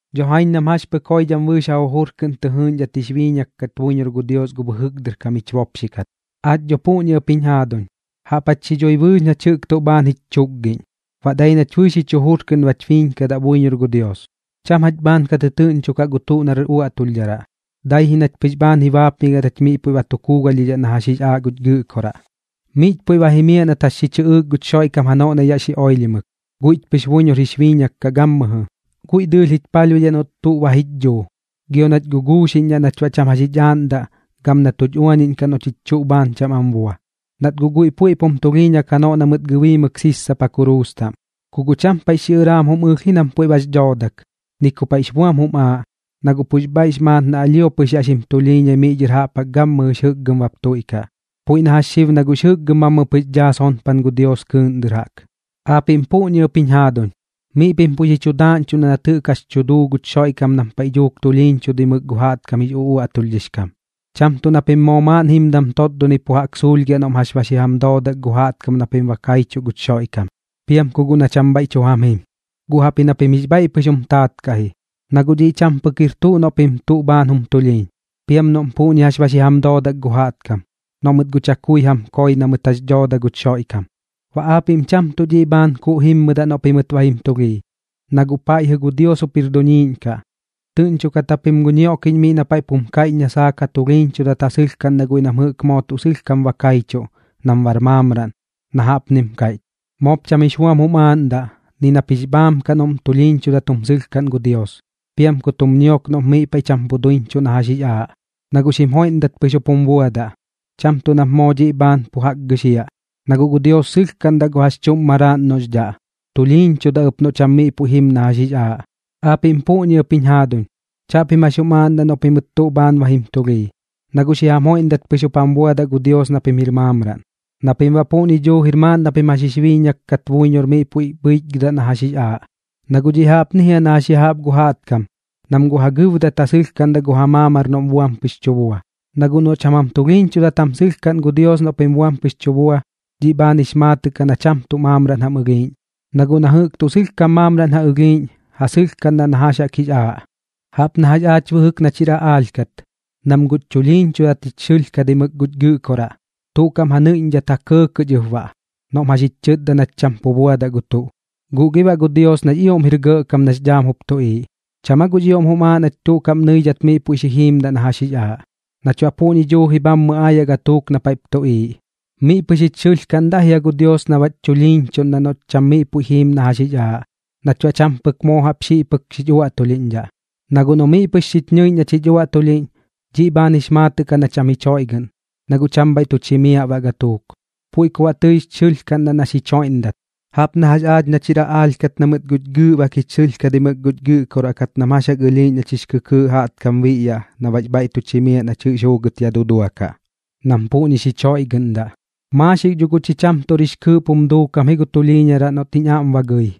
Dho jaiñ nam jax pɨk joidham bɨɨx ja jujur kɨꞌn tɨ jɨɨꞌñdhat jix biiñak kat buiñor gu Dios gu bɨjɨk dɨr kam jich bopxi kat. Aach dho puꞌñi ɨp jiñ jaaduñ, jaꞌp jach xi dhui bɨɨx nach jɨꞌk tuꞌ bhaan jich chukgiꞌñ, baꞌ dai nach bɨɨx jich jujur kɨꞌn bach biiñkadaꞌ buiñor gu Dios. Cham jach bhaan ka tɨtɨɨꞌñchokaꞌ gu tuꞌ nar uaꞌtulhdharaꞌ, dai ji nach pɨx bhaan ji baapmigiaꞌ nach miꞌ puiꞌ ba tu kuugalhdhidhaꞌ na jax jix aaꞌ guch Gɨꞌkoraꞌ. Miꞌch puiꞌ ba jimiaꞌ nat jax xi chɨꞌɨɨk guch Xoiꞌkam janoꞌ na yaꞌ xi oilhimɨk, guiꞌch pɨx buiñor jix biiñak kaꞌ gammɨjɨ. Guiꞌ dɨɨlh jich palhbuidhaꞌ noꞌt tuꞌ ba jich dhuu, gio nach guguuxiꞌñdhaꞌ nach baꞌ cham jax jich aaꞌndaꞌ, gam na tuch uañiꞌñkaꞌ noꞌ chich tuꞌ bhaan cham am bua, nat guꞌ guiꞌ puiꞌp jum tulhiiñak janoꞌ na mɨt gɨbiimɨk sissapa kuruus taꞌm. Ku guꞌ cham paiꞌx xiꞌɨraam jum ɨlh ji nam puiꞌ bax dhoodak, ni ku paiꞌx buam jum aaꞌ, na guꞌ pux bhaiꞌx maat na alhio pɨx yaꞌ xim tulhiiñai miꞌ dhɨr jaꞌp jaꞌk gammɨjɨx jɨkgɨm bap tuiꞌkaꞌ, puiꞌ na jax xib na guꞌx jɨkgɨm bhammɨ pɨx daa sonpan gu Dios kɨɨꞌn dɨr jaꞌk. Aapiꞌm puꞌñi ɨp jiñ jaaduñ, miꞌ pim puiꞌp xi chu daaꞌñchuꞌndaꞌ nat jɨꞌk jax tu duu guch Xoiꞌkam nam paiꞌ dhuuk tulhiiñchudimɨk gu jaꞌtkam jix uꞌuaꞌtulhdhix kam. Cham tuꞌ na pim moo maaꞌn jimdam totdonɨi pu jaꞌk suulhgiaꞌ noꞌm jax ba xi jam doodak gu jaꞌtkam na pim ba kaichuꞌ guch Xoiꞌkam, piam ku guꞌ na cham bhaiꞌ tu jam jim, guꞌ jaꞌpji na pim jix bhaiꞌ pɨx jum taat kaꞌ ji. Na guꞌ dhiꞌ cham pɨk jir tuꞌ noꞌ pim tuꞌ bhaan jum tulhiiñ, piam noꞌm puꞌñi jax ba xi jam doodak gu jaꞌtkam, noꞌ mɨt guꞌ chakui jam koi na mɨt jax dhooda guch Xoiꞌkam. Baꞌ aapiꞌm cham tuꞌ dhiꞌ bhaan kuuꞌ jimmɨdaꞌ noꞌ pimɨt ba jim tulhii, na guꞌ paiꞌ jɨꞌ Dios pɨx jir jup duniiꞌñ kaꞌ. Tɨꞌñchokat japim gu ñioꞌkiꞌñ miꞌ na paiꞌp jum kaiꞌch na saak ja tulhiiñchudat ja sɨlhkaꞌndaꞌ guiꞌ nam jɨꞌk moo tuꞌ sɨlhkam ba kaichuꞌ, nam bar maamraꞌn, na jaꞌpnim kaiꞌch: Moop cham jix buam jum aaꞌndaꞌ ni nap jix bhaam kaꞌ noꞌm tulhiiñchudat jum sɨlhkaꞌn gu Dios, piam kut jum ñiok noꞌp miꞌ paiꞌ cham pu duiñchuꞌ na jax jix aaꞌ, na guꞌ xim joiꞌndat pɨx jup jum buadaꞌ. Cham tuꞌ nap moo dhiꞌ bhaan pu jaꞌk gɨxiaꞌ. Na guꞌ gu Dios sɨlhkaꞌndaꞌ gu jax chuꞌm maraaꞌn noꞌx dhaꞌ, tulhiiñchudaꞌ ɨp noꞌ cham miꞌ puiꞌ jim na jax jix aaꞌ. Aapiꞌm puꞌñi ɨp jiñ jaaduñ, chaꞌpim jax jum aaꞌndaꞌ noꞌ pimɨt tuꞌ bhaan ba jim tulhii, na guꞌ xi jam joiꞌndat pɨx jup jam buadaꞌ gu Dios na pim jir maamraꞌn, na pim baꞌ puꞌñi duujir maaꞌn na pim jax jix biiñak kat buiñor miꞌ puiꞌ bhɨichgɨdaꞌ na jax jix aaꞌ. Na guꞌ dhiꞌ jaꞌpni jia na jax ya jaꞌp gu jaꞌtkam, nam guꞌ ja gɨbdat ja sɨlhkaꞌndaꞌ gu ja maamar noꞌm buam pɨx tu bua. Na guꞌ noꞌ cham jam tulhiiñchudat jam sɨlhkaꞌn gu Dios noꞌ pim buam pɨx tu bua, dhiꞌ bhaan jix maatɨꞌ kaꞌ na cham tuꞌ maamraꞌn jam ɨlhiiꞌñ, na guꞌ na jɨꞌk tuꞌ sɨlhkam maamraꞌn ja ɨlhiiꞌñ, ja sɨlhkaꞌndaꞌ na jax jaꞌk jix aaꞌ. Jaꞌp na jax aach bɨjɨk nach jir aꞌaalh kat, nam guꞌch chulhiiñchudat jich xɨlhkadimɨk guch gɨꞌkoraꞌ, tuꞌ kaꞌm ja nɨiꞌñdhat ja kɇɇkɇꞌ ich ɨp baꞌ noꞌm jax jich chɨtda nach cham pu buadaꞌ gu tuꞌ. Guꞌ gi baꞌ gu Dios nax ioꞌm jir gɇꞌkam nax dhaam jup tuꞌiiꞌ, ¿cham aa guꞌx ioꞌm jum aaꞌ nach tuꞌ kaꞌm nɨidhat miꞌ puiꞌ xi jiimdaꞌ na jax jix aaꞌ? Nach baꞌ guꞌ puꞌñi duuji bhammɨ aayaꞌ gatuuk na paiꞌp tuꞌiiꞌ. Miꞌ pɨx jich xɨlhkaꞌndaꞌ jia gu Dios na baꞌch chulhiiñchuꞌndaꞌ noꞌch cham miꞌ puiꞌ jiim na jax jix aaꞌ, nach baꞌ cham pɨk moo jaꞌp xiꞌ pɨk xich uaꞌtulhiꞌñdhaꞌ. Na guꞌ noꞌ miꞌ pɨx xich ñɨiꞌñ nach jich uaꞌtulhiꞌñ, dhiꞌ bhaan jix maatɨꞌ kaꞌ na cham jich joiꞌgɨꞌn, na guꞌ cham bhaiꞌ tuch jimiaꞌ baꞌ gatuuk. Puiꞌ ku baꞌ tɨich xɨlhkaꞌndaꞌ na xich joiꞌndat, jaꞌp na jax aach nach jir aꞌaalh kat na mɨt guꞌch gɨɨꞌbak jich xɨlhkadimɨk guch gɨꞌkoraꞌ kat nam jax jaꞌk ɨlhiiꞌñ nach jix kɨkɨɨꞌ jaꞌtkam biꞌyaꞌ, na baꞌx bhaiꞌ tuch jimiaꞌ nach jɨꞌx juugɨt ya duduakaꞌ, nam puꞌñi xich joiꞌgɨꞌndaꞌ. Maaxik dho guꞌ cham tuꞌr jix kɨɨꞌp jum duukam gu tulhiiñaraꞌ noꞌt jiñ aꞌm ba gɨi,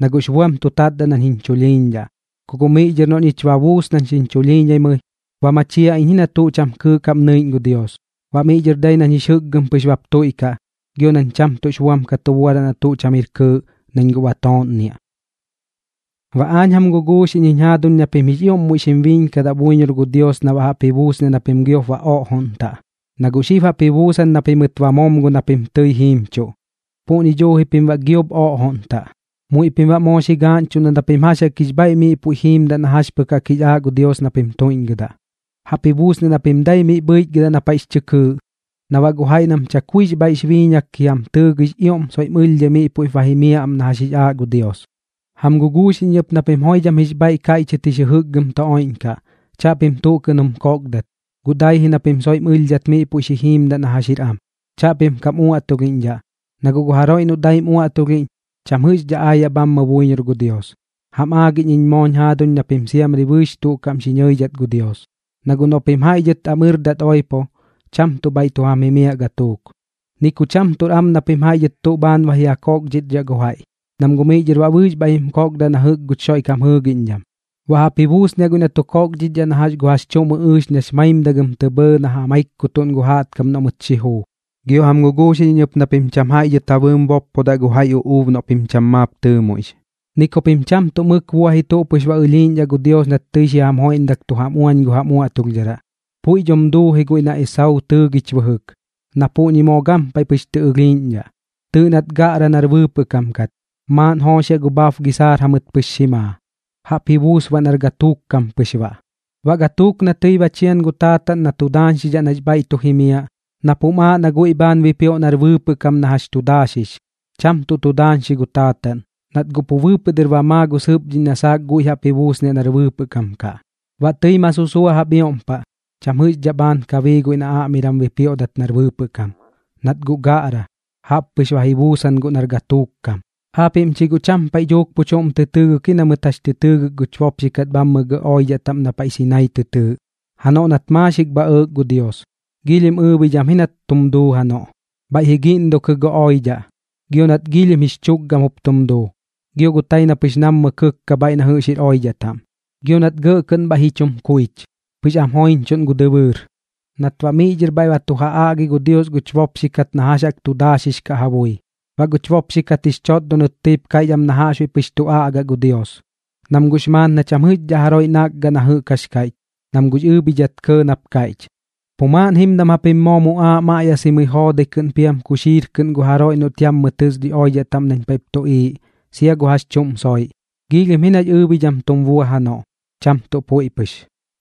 na guꞌx buam tu tatdaꞌ nañ jiñ chulhiiñdhaꞌ. Ku guꞌ miꞌ dhɨr noꞌ ñich ba buus nañ xiñ chulhiiñaimɨi, ba machiaꞌ iñ ji na tuꞌ cham kɨɨꞌ kaꞌm nɨiꞌñ gu Dios. Baꞌ miꞌ dhɨr dai nañ jix jɨkgɨm pɨx bap tuiꞌkaꞌ, gio nañ cham tuꞌx buam ka tu buadaꞌ na tuꞌ cham jir kɨɨꞌ, nañ guꞌ ba tooꞌnniaꞌ. Baꞌ aañ jam guguuxiꞌñ jiñ jaaduñ na pim jix ioꞌm muiꞌ xim biiñkadaꞌ buiñor gu Dios na baꞌ jaꞌp ji buusniaꞌ na pim giop ba oꞌjoꞌntaꞌ, na guꞌ xib jaꞌp ji buusan na pimɨt ba momgo na pim tɨi jiimchuꞌ, puꞌñi duuji pim baꞌ giop oꞌjoꞌntaꞌ. Muiꞌ pim baꞌ moo xi gaaꞌñchuꞌndaꞌ na pim jax jaꞌk jix bhaiꞌ miꞌ puiꞌ jiimdaꞌ na jax pɨk jaꞌk jix aaꞌ gu Dios na pim tuiꞌñgɨdaꞌ. Jaꞌp ji buusniaꞌ na pim dai miꞌ bhɨichgɨdaꞌ na paiꞌx chɨ kɨɨꞌ, na baꞌ gu jaiꞌ nam chakuix bhaiꞌx biiñak ji jam tɨɨgɨi jix ioꞌm soiꞌm ɨlhdhai miꞌ puiꞌp ba jimiaꞌ am na jax jix aaꞌ gu Dios. Jam guguuxiꞌñ iñ ɨp na pim joidham jix bhaiꞌ kaiꞌchɨt jix jɨjɨkgɨm tu oiꞌñkaꞌ, chaꞌpim tuꞌ kɨꞌn jum kokdat, guꞌ dai ji na pim soiꞌm ɨlhdhat miꞌ puiꞌ xi jiimdaꞌ na jax jir am. Chaꞌpim kam uaꞌtulhiꞌñdhaꞌ, na guꞌ gu jaroiꞌ noꞌ daim uaꞌtulhiꞌñ, cham jɨꞌxdhaꞌ aayaꞌ bhammɨ buiñor gu Dios. Jam aagiꞌñ iñ mooñ jaaduñ na pim siamri bɨɨx tuꞌ kaꞌm xi ñɨidhat gu Dios. Na guꞌ noꞌ pim jaiꞌ dhɨt am ɨrdat oipo, cham tuꞌ bhaiꞌ tu jam jimiaꞌ gatuuk. Ni ku cham tuꞌr am na pim jaiꞌ dhɨt tuꞌ bhaan ba ji ja koꞌkdhichdhaꞌ gu jaiꞌ, nam guꞌ miꞌ dhɨr baꞌ bɨɨx bhaiꞌ jim koodaꞌ na jɨꞌk guch Xoiꞌkam jɨɨgiꞌñdham. Baꞌ jaꞌp ji buusniaꞌ guiꞌ na tu koꞌkdhichdhaꞌ na jax gu jax chuꞌm ɨꞌɨɨx nax maimdagɨm tɇ bhɇɇ na ja maikkutuꞌn gu jaꞌtkam noꞌ mɨt xi juu. Gio jam guguuxiꞌñ iñ ɨp na pim cham jaiꞌ dhɨt ja bɨɨm boppodaꞌ gu jaiꞌ uꞌuub noꞌ pim cham maap tɨɨmuiꞌx. Ni ku pim cham tuꞌ mɨk buaꞌ ji tuꞌ pɨx ba ɨlhiiꞌñdhaꞌ gu Dios nat tɨi xi jam joiꞌndak tu jam uañ gu jam uaꞌtulhdharaꞌ. Puiꞌ dhom duu ji guiꞌ na Esauu tɨɨgich bɨjɨk, na puꞌñi moo gampaiꞌ pɨx tɨ ɨlhiiꞌñdhaꞌ. Tɨɨꞌ nat gaꞌra nar bɨɨpɨꞌ kam kat, maaꞌn jooxiaꞌ gu bhab gisaar jamɨt pɨx xi maa, jaꞌp ji buus baꞌ nar gatuuk kam pɨx baꞌ. Baꞌ gatuuk na tɨi ba chian gu taataꞌn na tu daañxidhaꞌ nax bhaiꞌ tu jimiaꞌ, nap jum aaꞌ na guiꞌ bhaan bipioꞌ nar bɨɨpɨꞌ kam na jax tu daaxix, cham tuꞌ tu daañxi gu taataꞌn, nat guꞌ pu bɨɨpɨꞌ dɨr ba maa gu sɨpdhiꞌñ na saak guiꞌ jaꞌp ji buusniaꞌ nar bɨɨpɨꞌ kam kaꞌ. Baꞌ tɨi ma susua jaꞌp ioꞌm paꞌ, cham jɨꞌxdhaꞌ bhaan ka bii guiꞌ na aꞌmiram bipioꞌdat nar bɨɨpɨꞌ kam, nat guꞌ gaꞌra, jaꞌppɨx ba ji buusan guꞌ nar gatuuk kam. Aapiꞌm chi guꞌ cham paiꞌ dhuuk pu chuꞌm tɨ tɨɨgɨk ji na mɨt jax tɨ tɨɨgɨk guch bopxi kat bhammɨ gɇꞌ oidhaꞌ taꞌm na paiꞌ Sinaii tɨ tɨɨꞌ, janoꞌ nat maaxik bha ɇɇk gu Dios. Giilhim ɨɨbhidham ji nat tum duu janoꞌ, bhaiꞌ ji giꞌndukɨ gu oidhaꞌ, gio nat giilhim jix chukgam jup tum duu, gio gu tai na pɨx nammɨ kɨkka bhaiꞌ na jɨꞌx jir oidhaꞌ taꞌm. Gio nat gɇꞌ kɨꞌn bhaiꞌ ji chum kuich, pɨx am joiñchuꞌn gu dɨbɨɨr, nat baꞌ miꞌ dhɨr bhaiꞌ ba tu ja aꞌgi gu Dios guch bopxi kat na jax jaꞌk tu daaxix kaꞌ ja bui. Baꞌ guch bopxi kat jix chotdonɨt tɨip kaiꞌch am na jaꞌxbuiꞌ pɨx tu aꞌgaꞌ gu Dios, nam guꞌx maat na cham jɨꞌxdhaꞌ jaroiꞌ nakgaꞌ na jɨꞌk jax kaiꞌch, nam guꞌx ɨɨbhidhat kɇɇ nap kaiꞌch: “Pu maaꞌn jimdam japim moo muꞌaaꞌ maꞌyasimɨi joodai kɨꞌn piam kuxiir kɨꞌn gu jaroiꞌ noꞌt gan yammɨ tɨs oidhaꞌ taꞌm nañ paiꞌp tuꞌiiꞌ, sia gu jax chuꞌm soiꞌ.” Giilhim ji nax ɨɨbhidham tum bua janoꞌ, cham tuꞌ puiꞌ pɨx.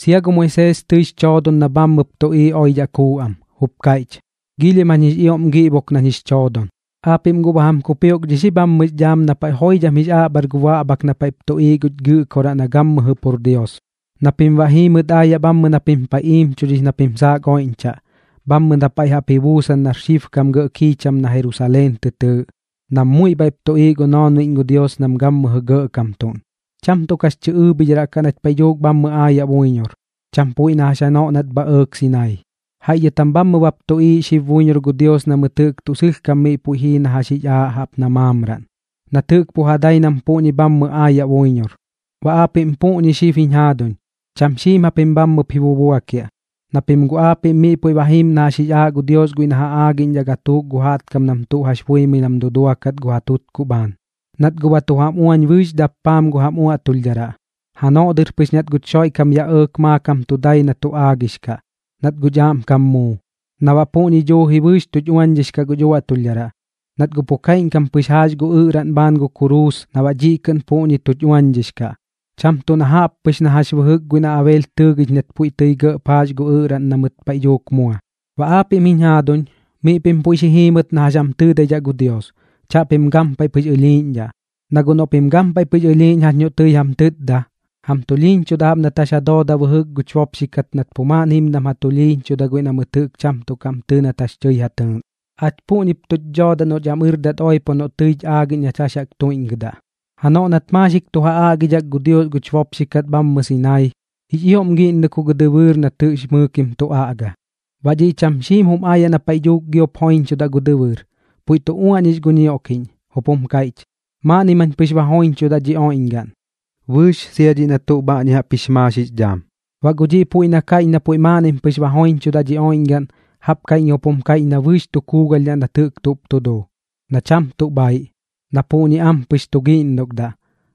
Sia gu Moisees tɨix choodon na bhammɨp tuꞌiiꞌ oidhaꞌ kuu am, jup kaiꞌch: “Giilhim jañ jix ioꞌm giꞌbok nañ jix choodon.” Aapiꞌm guꞌ ba jam kupioꞌkdhix ji bhammɨx dhaam na paiꞌ joidham jix aꞌbhar gu baꞌbhak na paiꞌp tuꞌiiꞌ guch Gɨꞌkoraꞌ na gammɨjɨ pur Dios, na pim baꞌ jiimɨt aayaꞌ bhammɨ na pim paiꞌ iimchudhix na pim saak oiꞌñchaꞌ, bhammɨ na paiꞌ jaꞌp ji buusan nar xibkam gɇꞌ kiicham na Jerusaleen tɨ tɨɨꞌ, nam muiꞌ bhaiꞌp tuꞌiiꞌ gu noonbiꞌñ gu Dios nam gammɨjɨ gɇꞌkamtuꞌn. Cham tuꞌ kax chɨ ɨɨbhidharaꞌ kaꞌ nach paiꞌ dhuuk bhammɨ aayaꞌ buiñor, cham puiꞌ na jax janoꞌ nat bha ɇɇk Sinaii. Jaiꞌ dhɨt jam bhammɨ bap tuꞌiiꞌ xib buiñor gu Dios na mɨt jɨꞌk tuꞌ sɨlhkam miꞌ puiꞌ jii na jax jix aaꞌ jaꞌp na maamraꞌn, nat jɨꞌk pu ja dai nam puꞌñi bhammɨ aayaꞌ buiñor. Baꞌ aapiꞌm puꞌñi xib jiñ jaaduñ, cham xiim japim bhammɨp ji bubuakiaꞌ, na pim guꞌ aapiꞌm miꞌ puiꞌ ba jiim na jax jix aaꞌ gu Dios guiꞌ na ja aagiꞌñdhaꞌ gatuuk gu jaꞌtkam nam tuꞌ jax buimɨi nam duduakat ja tutkuꞌ bhaan, nat guꞌ ba tu jam uañ bɨɨx dappaam gu jam uaꞌtulhdharaꞌ, janoꞌ dɨr pɨx nat guch Xoiꞌkam yaꞌ ɇɇk maakam tu dai na tu aagix kaꞌ, nat guch aꞌmkam muu, na baꞌ puꞌñi duuji bɨɨx tuch uañdhix kaꞌ guch uaꞌtulhdharaꞌ. Nat guꞌ pu kaiꞌñkam pɨx jaax gu ɨꞌraꞌn bhaan gu kuruus na baꞌ dhiꞌ kɨꞌn puꞌñi tuch uañdhix kaꞌ, cham tuꞌ na jaꞌp pɨx na jax bɨjɨk guiꞌ na Abeel tɨɨgich nat puiꞌ tɨi gɇꞌp jaax gu ɨꞌraꞌn na mɨt paiꞌ dhuuk mua. Baꞌ aapiꞌm jiñ jaaduñ, miꞌ pim puiꞌ xi jiimɨt na jax jam tɨɨdaidhaꞌ gu Dios, chaꞌpim gampaiꞌ pɨx ɨlhiiꞌñdhaꞌ. Na guꞌ noꞌ pim gampaiꞌ pɨx ɨlhiiꞌñ jax noꞌ tɨi jam tɨtda, jam tulhiiñchudaꞌ jaꞌp nat jax ja dooda bɨjɨk guch bopxi kat nat pu maaꞌn jimdam ja tulhiiñchuda guiꞌ na mɨt jɨꞌk cham tuꞌ kaꞌm tɨɨ nat jax tɨi ja tɨɨꞌn. Aach puꞌñip tuch dhoodaꞌ noꞌch am ɨrdat oipo noꞌ tɨich aꞌgiꞌñ nach jax jaꞌk tuiꞌñgɨdaꞌ. Janoꞌ nat maaxik tu ja aꞌgidhak gu Dios guch bopxi kat bhammɨ Sinaii, jix ioꞌm giꞌndukɨ gu dɨbɨɨr nat jɨꞌx mɨɨkim tu aꞌga. Baꞌ dhiꞌ cham xiim jum aayaꞌ na paiꞌ dhuuk giop joiñchudaꞌ gu dɨbɨɨr, puiꞌ tu uaꞌñix gu ñioꞌkiꞌñ, jup jum kaiꞌch: “Maaꞌnnim jañ pɨx ba joiñchudaꞌ dhi oiꞌñgaꞌn, bɨɨx sia dhiꞌ na tuꞌ bhaꞌñi jaꞌp jix maax jix dhaam.” Baꞌ gu dhiꞌ puiꞌ na kaiꞌch na puiꞌ maaꞌnnim pɨx ba joiñchudaꞌ dhi oiꞌñgaꞌn, jaꞌp kaiꞌñkam jup kaiꞌch na bɨɨx tu kuugalhdhaꞌ nat jɨꞌk tuꞌp tu duu, na cham tuꞌ bhaiꞌ, na puꞌñi ampɨx tu giꞌndukdaꞌ,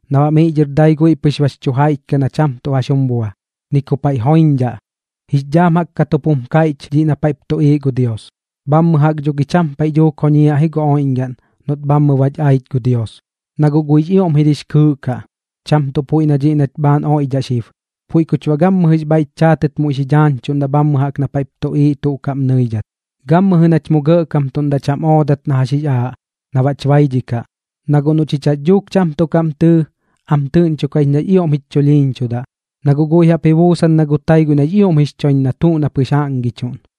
na baꞌ miꞌ dhɨr dai guiꞌ pɨx bax chu jaiꞌch kaꞌ na cham jax jum bua, ni ku paiꞌ joiñdhaꞌ. Jix dhaam jaꞌk kat jup jum kaiꞌch dhiꞌ na paiꞌp tuꞌiiꞌ gu Dios, bhammɨ jaꞌk dho gi cham paiꞌ dhuuk joñiaꞌ ji gu oiꞌñgaꞌn noꞌt bhammɨ bach aich gu Dios. Na guꞌ guiꞌx ioꞌm jir jix kɨɨꞌ kaꞌ, cham tuꞌ puiꞌ na dhiꞌ nach bhaan oiꞌdhaꞌ xib. Puiꞌ kuch baꞌ gammɨjɨx bhaiꞌch chaatɨt muiꞌ xi dhaañchuꞌndaꞌ bhammɨ jaꞌk na paiꞌp tuꞌiiꞌ tuꞌ kaꞌm nɨidhat. Gammɨjɨ nach mu gɇꞌkamtuꞌndaꞌ cham oodat na jax jaꞌk jix aaꞌ, na baꞌch baidhikaꞌ. Na guꞌ noꞌ chich jax dhuuk cham tuꞌ kaꞌm tɨɨ, am tɨꞌñchokaꞌ ich nax ioꞌm jich chulhiiñchudaꞌ, na guꞌ guiꞌ jaꞌp ji buusan na gu tai guiꞌ nax ioꞌm jix choiñ na tuꞌ na pɨx jaꞌngichuꞌn.